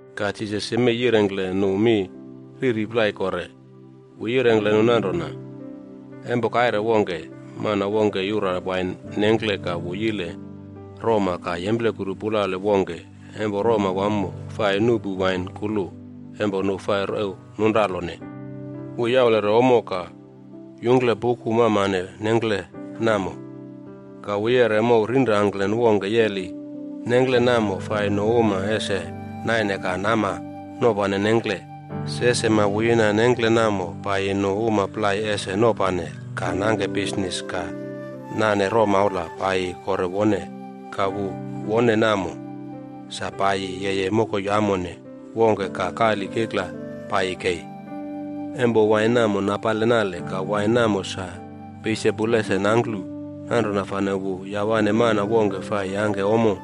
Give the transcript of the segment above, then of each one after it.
Ka Jisas yemei yirengkle nu mi riri plai kore. Wu yirengkle nu nanrona, “Empo kaire wongke, mana wongke yura wain nengkle ka wu yile roma ka yemplekuru pulale wongke empo roma wamo fai nuꞌpu wain kulu empo nu fai rew nunralone. Wu yaulere ommo ka yungkle puku mamane nengkle namo. Ka wu yeꞌre mow rinrangklen wongke yeli nengkle namo fai nu uma ese naine ka nama nopane nengkle. Se sema wu yina nengkle namo paiyi nu uma plai ese nopane ka nangke bisnis ka nane romaula paiyi kore wone. Ka wu wone namo, sa paiyi yeye mokoi amone wongke ka kali kikla paiye kei. Empo wain namo napale nale ka wain namo sa peisepu lese nangklu. Nanrona fane wu yawane mana wongke fai yangke ommo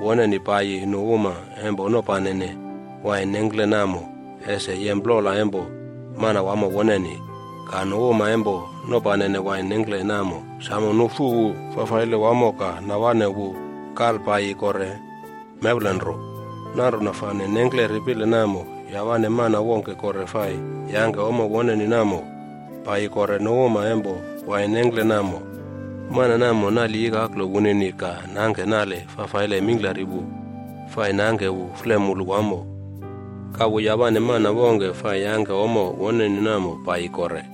woneni paiyi nu uma empo nopanene wain nengkle namo ese yem plola empo manawamo woneni. Ka nu uma empo nopanene wain nengkle namo samo nufu wu fafaile wamo ka nawane wu kalpaiyi kore mewlenro. Nanrona fane nengkle ripile namo, yawane mana wongke kore fai yangke ommo woneni namo paiyi kore nu uma empo wain nengkle namo. Mana namo nali ikaklo wunini ka nangke nale fafaile mingklari wu fai nangke wu flemulu wamo. Ka wu yawane mana wongke fai yangke ommo woneni namo paiyi kore.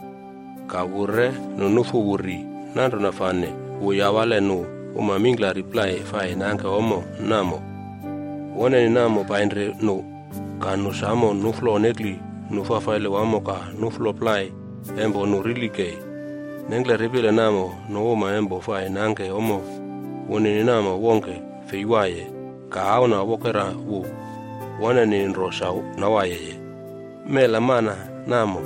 Ka wu re nu nufu wu ri. Nanrona fane wu yawale nu uma mingklari plai fai nangke ommo woneni namo painri nu. Ka nu samo nuflo nekli nu fafaile wamo ka nuflo plai empo nu rili kei.” “Nengkle ripile namo, nu uma empo fai nangke ommo wunini namo wongke fei waiye. Ka auna wokera wu woneni nro sa nawaiye. Mela mana namo,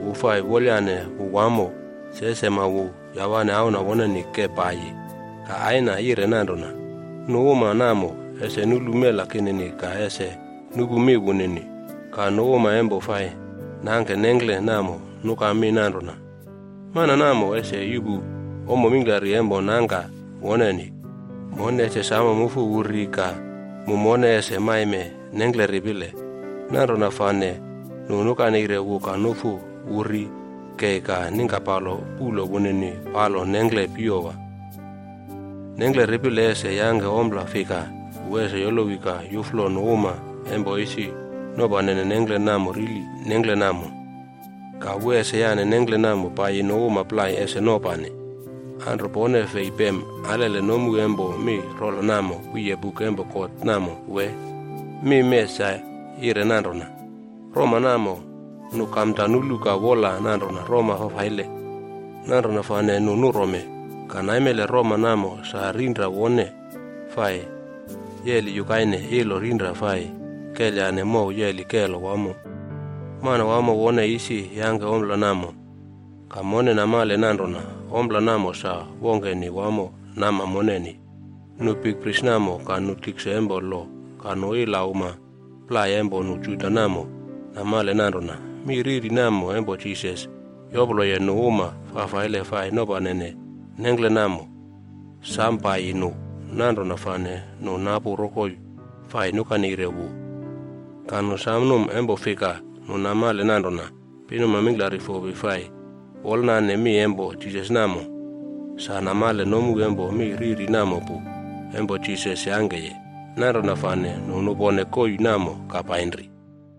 wu fai wolayane wu wamo. Se sema wu yawane auna woneni ke paiyi. Ka aina yire nanrona, ‘Nu uma namo ese nulu mela kinini ka ese nupu mi wunini.’” “Ka nu uma empo fai nangke nengkle namo nuka mi nanrona, ‘Mana namo ese yuꞌpu ommo mingklari empo nangka woneni. Mone ese samo mufu wu ri ka mu mone ese maime nengkle ripile.’ Nanrona fane nu nukaneire wu ka nufu wu ri kei ka ningkapalo puꞌlo wunini palo nengkle piyowa.” “Nengkle ripile ese yangke ompla fika? Wu ese yolowi ka yuflo nu uma empo isi nopanene nengkle namo rili nengkle namo. Ka wu ese yane nengkle namo paiyi nu uma plai ese nopane. Anro pone fei pem alele nomu empo mi rola namo wiye buk empo God namo wee? Mi mee sa yire nanrona, ‘Roma namo, nu kamda nulu ka wola nanrona roma fafaile. Nanrona fane nu nurome. Ka naimele roma namo sa rinra wone fai yeli yukaine ilo rinra fai kelyane mow yeli kelo wamo. Manawamo wone isi yangke ompla namo, ka mone namale nanrona ompla namo sa wongkeni wamo nama moneni.’” Nu bikpris namo ka nu tikse empo lo ka nu ila uma plai empo nu Juda namo namale nanrona mi riri namo empo Jisas yoploye nu uma fafaile fai nopanene nengkle namo, sam paiyi nu. Nanrona fane nu napu rokoi fai nukaneire wu. Ka nu sa numa empo fika nu namale nanrona pinuma mingklari fopi fai wolnane mi empo Jisas namo, sa namale nomu empo mi riri namo pu empo Jisas yangkeye. Nanrona fane nu nupone koii namo ka painri.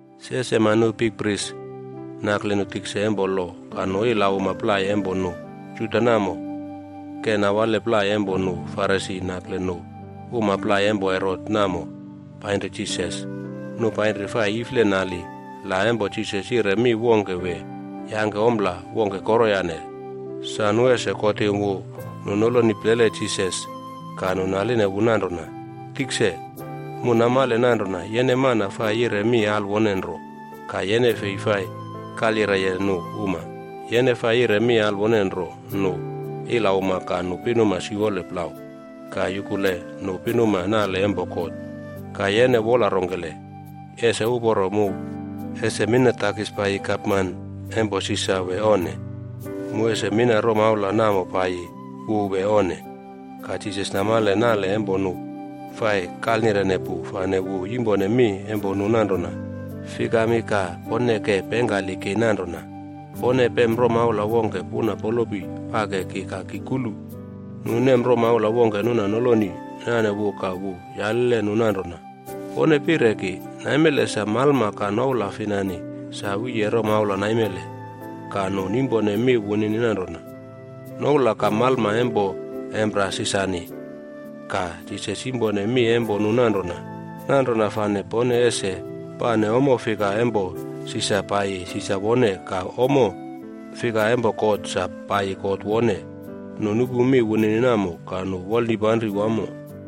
Se sema nu bikpris nakle nu tikse empo lo ka nu ila uma plai empo nu Juda namo, ke nawale plai empo nu Farisi nakle nu uma plai empo Herot namo painri Jisas. Nu painri fai ifle nali la empo Jisas yire mi wongke wee yangke ompla wongke koroyane sa nu ese kotim wu. Nu noloni plele Jisas ka nu naline wu nanrona, “Tikse, mu namale nanrona yene mana fai yire mi alwone nro ka yene fei fai kalyireye nu uma. Yene fai yire mi alwone nro nu ilauma ka nu pinuma siwole plau ka yukule nu pinuma nale empo God. Ka yene wola rongkele, ese uporo empo mu ese mina takis paiyi gapman empo Sisar wee onne? Mu ese mina romaula namo paiyi wu wee onne?” Ka Jisas namale nale empo nu fai kalnirene pu, fane wu yimpone mi empo nu nanrona, “Fikami ka pone ke pengkali ki nanrona? Pone pem romaula wongke puna polopi pake ki ka ki kulu.” Nu nem romaula wongke nuna noloni nane wu ka wu yalile nu nanrona, “Pone pire ki, naimele sa malma ka noula finani sa wiye romaula naimele?” Ka nu nimpone mi wunini nanrona, “Noula ka malma empo Empera Sisarni.” Ka Jisas yimpone mi empo nu nanrona, “Nanrona fane pone ese pane ommo fika empo Sisar paiyi Sisar wone ka ommo fika empo God sa paiyi God wone.” Nu nupu mi wunini namo ka nu wolnipanri wamo.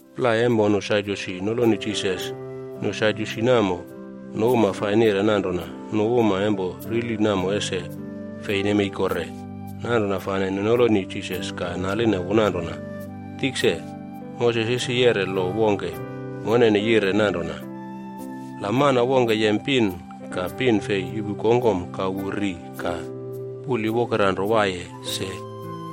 Plai empo nu Sadyusi noloni Jisas. Nu Sadyusi namo, nu uma fai nire nanrona nu uma empo rili namo ese fei nemei kore. Nanrona fane nu noloni Jisas ka naline wu nanrona, “Tikse, Moses isi yeꞌre lo wongke moneni yire nanrona, la mana wongke yem pin ka pin fei yuꞌpu kongkom ka wu ri ka puli wonkere nro waiye se,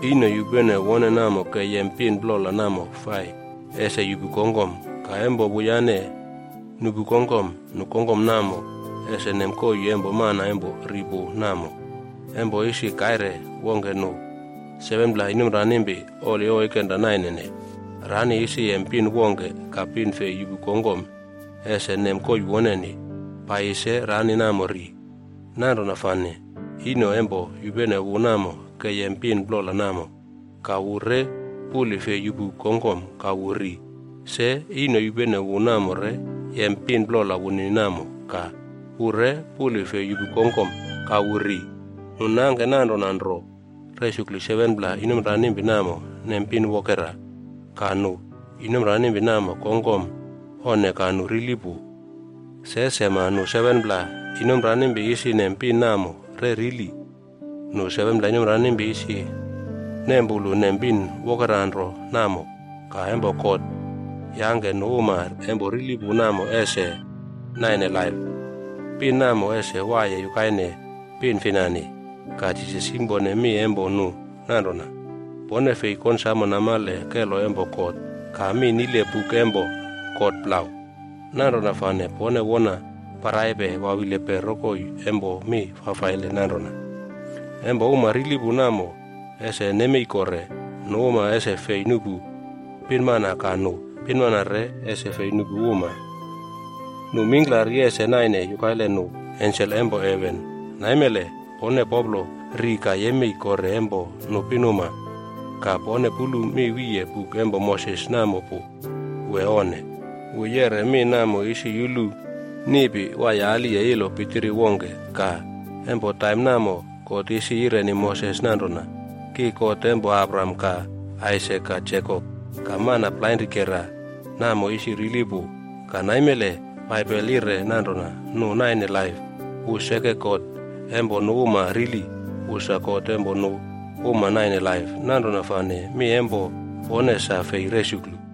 ino yupene wone namo ke yem pin plola namo fai ese yuꞌpu kongkom. Ka empo wuyane nuꞌpu kongkom, nu kongkom namo ese nem koii empo mana empo ri pu namo. Empo isi kaire wongke nu 7pla inomranimpi oli oikenra nainene. Rani isi yem pin wongke ka pin fei yuꞌpu kongkom ese nem koii woneni. Paiyi se rani namo ri. Nanrona fane ino empo yupene wu namo ke yem pin plola namo. Ka wu re puli fei yuꞌpu kongkom ka wu ri. Se, ino yupene wu namo re yem pin plola wunini namo ka wu re puli fei yuꞌpu kongkom ka wu ri. Nu nangke nanrona nro resuklu 7pla inomranimpi namo nem pin wokera, ka nu inomranimpi namo kongkom onne ka nu rili pu. Se sema, nu 7pla inomranimpi isi nem pin namo re rili. Nu 7pla inomranimpi isi nempulu nem pin wokeranro namo. Ka empo God yangke nu uma empo rili pu namo ese naine laip, pin namo ese waiye yukaine pin finani.” Ka Jisas yimpone mi empo nu nanrona, “Pone fei konsamo namale kelo empo God ka mi nile buk empo God plau. Nanrona fane pone wona paraipe wawilipe rokoi empo mi fafaile nananrona. Empo uma rili pu namo ese nemei kore, nu uma ese fei nuꞌpu pinmana ka nu pinmana re ese fei nuꞌpu uma. Nu mingklari ese naine yukaile nu ensel empo heven.” “Naimele pone poplo ri ka yemei kore empo nu pinuma. Ka pone pulu mi wiye buk empo Moses namo pu wee onne? Wu yeꞌre mi namo isi yulu niꞌpi waiye aliye ilo pitiri wongke. Ka empo taim namo, God isi yireni Moses nanrona, ‘Ki God empo Abraham ka Aisak ka Jekop.’ Ka mana plainrikera namo isi rili pu, ka naimele Baibel yire nanrona nu naine laip. Wu seke God empo nu uma rili, wu sa God empo nu uma naine laip. Nanrona fane mi empo pone sa fei resuklu.”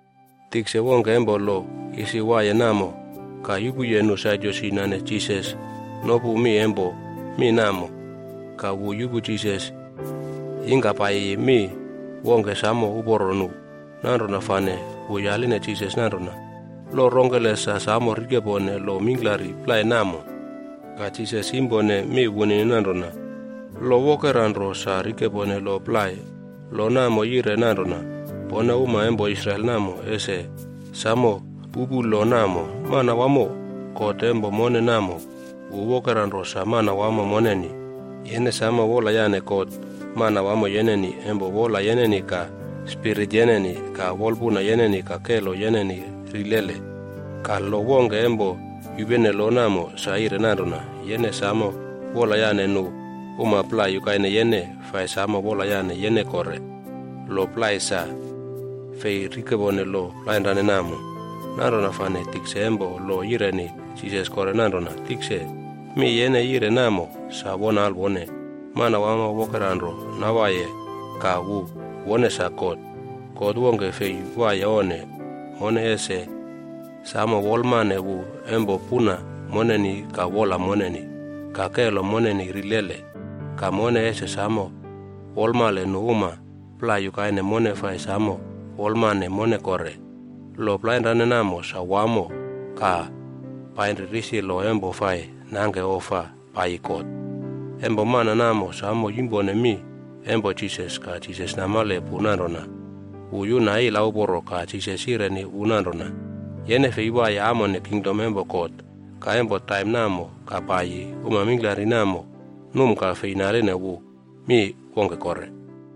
Tikse wongke empo lo isi waiye namo ka yupuye nu Sadyusi nane Jisas nopu mi empo mi namo. Ka wu yupu Jisas yingkapaiyi mi wongke samo uporo nu. Nanrona fane wu yaline Jisas nanrona, “Lo rongkele sa samo rikepone lo mingklari plai namo?” Ka Jisas yimpone mi wunini nanrona, “Lo wokera nro samo rikepone lo plai. Lo namo yire nanrona, Pone uma empo Israel namo ese samo pupu lo namo. Manawamo, God empo mone namo, wu wokera nro sa Manawamo moneni. Yene samo wolayane God, Manawamo yeneni empo wola yeneni ka spirit yeneni, ka wolpuna yeneni ka kelo yeneni rilele.’ Ka lo wongke empo yupene lo namo sa yire nanrona, Yene samo wolayane nu uma plai yukaine yene fai samo wolayane yene kore.’ Lo plai ese fei rikepone lo plainrane namo.” Nanrona fane tikse empo lo yireni Jisas kore nanrona, “Tikse, mi yene yire namo sa won alwone. Manawamo wokera nro nawaiye ka wu wone sa God. God wongke fei waiye onne. Mone ese samo wolmane wu empo puna moneni ka wola moneni, ka kelo moneni rilele. Ka mone ese samo wolamale nu uma plai yukaine mone fai samo wolamane mone kore. Lo plainrane namo sa wamo ka painri risi lo empo fai nangke ofa paiyi God.” Empo mana namo samo yimpone mi empo Jisas ka Jisas namale pu nanrona wu yuna ila uporo ka Jisas yireni wu nanrona, “Yene fei waiye amone kingdom empo God.” Ka empo taim namo ka paiyi, uma mingklari namo num ka fei naline wu mi wongke kore.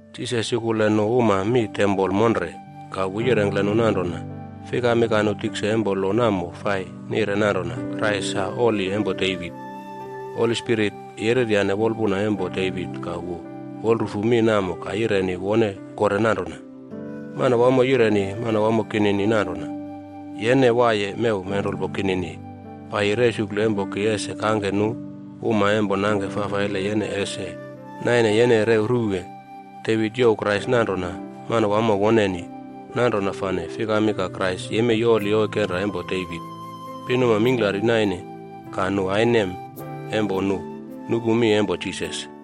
Jisas yukule nu uma mi tempol monre ka wu yirengkle nu nanrona, “Fikami ka nu tikse empo lo namo fai nire nanrona Krais sa oli empo Devit? Holi Spirit yereryane wolpuna empo Devit ka wu wolrufu mi namo ka yireni wone kore nanrona, Manawamo yireni Manawamo kinini nanrona, Yene waiye mew menrulpo kinini paiyi resuklu empo ki ese kangke nu uma empo nangke fafaile yene ese naine yene rew ruwe.”’” “Devit youw Krais nanrona Manawamo woneni. Nanrona fane fikami ka Krais yemei oli oikenra empo Devit?” Pinuma mingklari naine ka nu ainem empo nu nupu mi empo Jisas.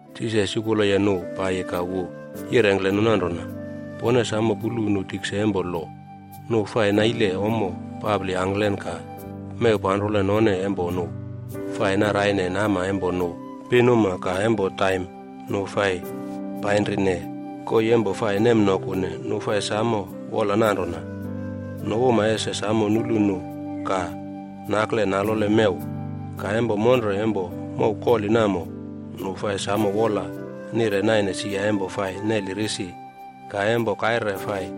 Jisas yukuleye nu paiyi ka wu yirengkle nu nanrona, “Pone samo pulu nu tikse empo lo. Nu fai naile ommo papli angklen ka mew panrole none empo nu fai naraine nama empo nu pinuma ka empo taim nu fai painrine koii empo fai nemnokune. Nu fai samo wola nanrona, nu uma ese samo nulu nu ka nakle nalole mew. Ka empo monre empo mow koli namo, nu fai samo wola nire naine sia empo fai neli risi. Ka empo kaire fai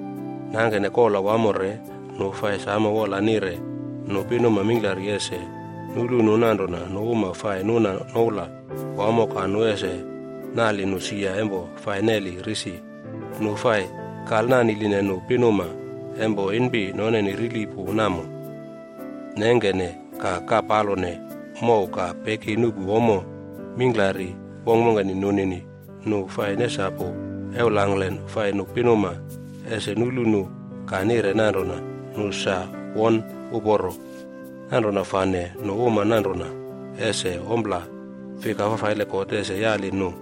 nangkene kola wamo re, nu fai samo wola nire nu pinuma mingklari ese nulu nu nanrona nu uma fai nuna noula wamo ka nu ese nali nu sia empo fai neli risi. Nu fai kalnaniline nu pinmana empo inpi noneni rili pu namo nengkene ka kapalone mow ka peki nupu ommo mingklari wongkwongkeni nunini. Nu fai nesapu ewlangklen fai nu pinuma ese nulu nu ka nire nanrona nu sa won uporo. Nanrona fane nu uma nanrona, ese ompla fika fafaile God ese yali nu,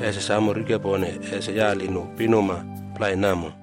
ese samo rikepone ese yali nu pinuma plai namo.”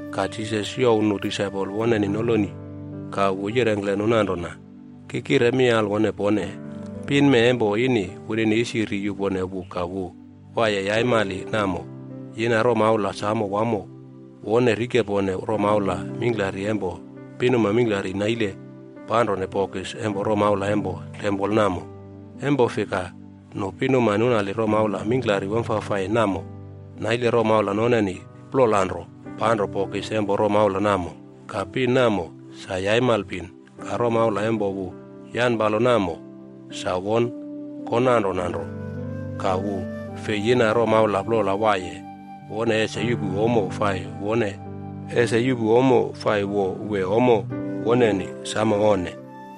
Ka Jisas youw nu disaipol woneni noloni wu ka wu yirengkle nu nanrona, “Ki kire mi alwone pone. Pin mee empo ini wunini isi ri yupone wu ka wu waiye yaimali namo, yina romaula samo wamo wone rikepone romaula mingklari empo pinuma mingklari naile panrone bokis empo romaula empo tempol namo. Empo fika nu pinuma nunali romaula mingklari wamfafai namo, naile romaula noneni plola nro panro bokis empo romaula namo. Ka pin namo, sa yaimal pin, ka romaula empo wu yanpalo namo, sa won konanrona nro. Ka wu fei yina romaula plola waiye wone ese yuꞌpu ommo fai wo wee ommo woneni. Samo onne!”